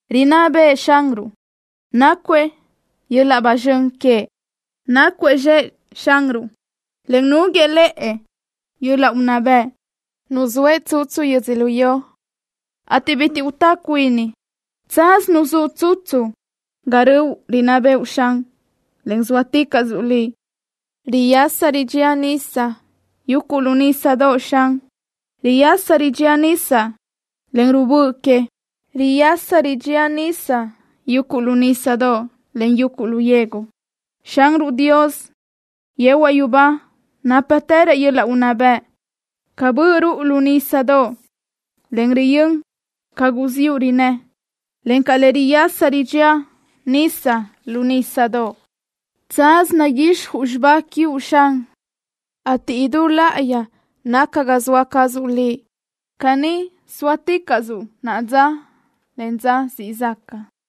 ¡Rinná bëʼë Xanruʼ! ¡Nácuëʼ yöl-laʼ ba zxön queëʼ! ¡Nácuëʼ zxëʼ Xanruʼ, en núguiëʼ lëʼë yöl-laʼ unná bëʼ! ¡Nuzóëʼ tsutsu yödzölió, ateʼ bitiʼ utá cuini! ¡Tsaz nuzúʼ tsutsu ga röʼu rinná bëʼu, Xan, en zóaticaʼsuʼ Liʼ! Riyasa ridxía nisa yuguʼ lu nísadoʼ, Xan. Riyasa ridxía nisa, en ruʼu bö que. Riyasa ridxía nisa yuguʼ lu nísadoʼ, en yuguʼ lu yegu. Xanruʼ Dios yehuaʼ yubá nápatërëʼ yöl-laʼ unná bëʼ ca bö ruʼu lu nísadoʼ le riyö́n ca guziúʼ rinnë́, encaʼ ca le riyasa ridxía nisa lu nísadoʼ. Tsaz naguixjuʼ xibá quiuʼ, Xan, ateʼ idú láʼayi naca ga zoa cazuʼ Liʼ. Caní zóaticaʼsö naʼa dza, en dza siʼ zaca.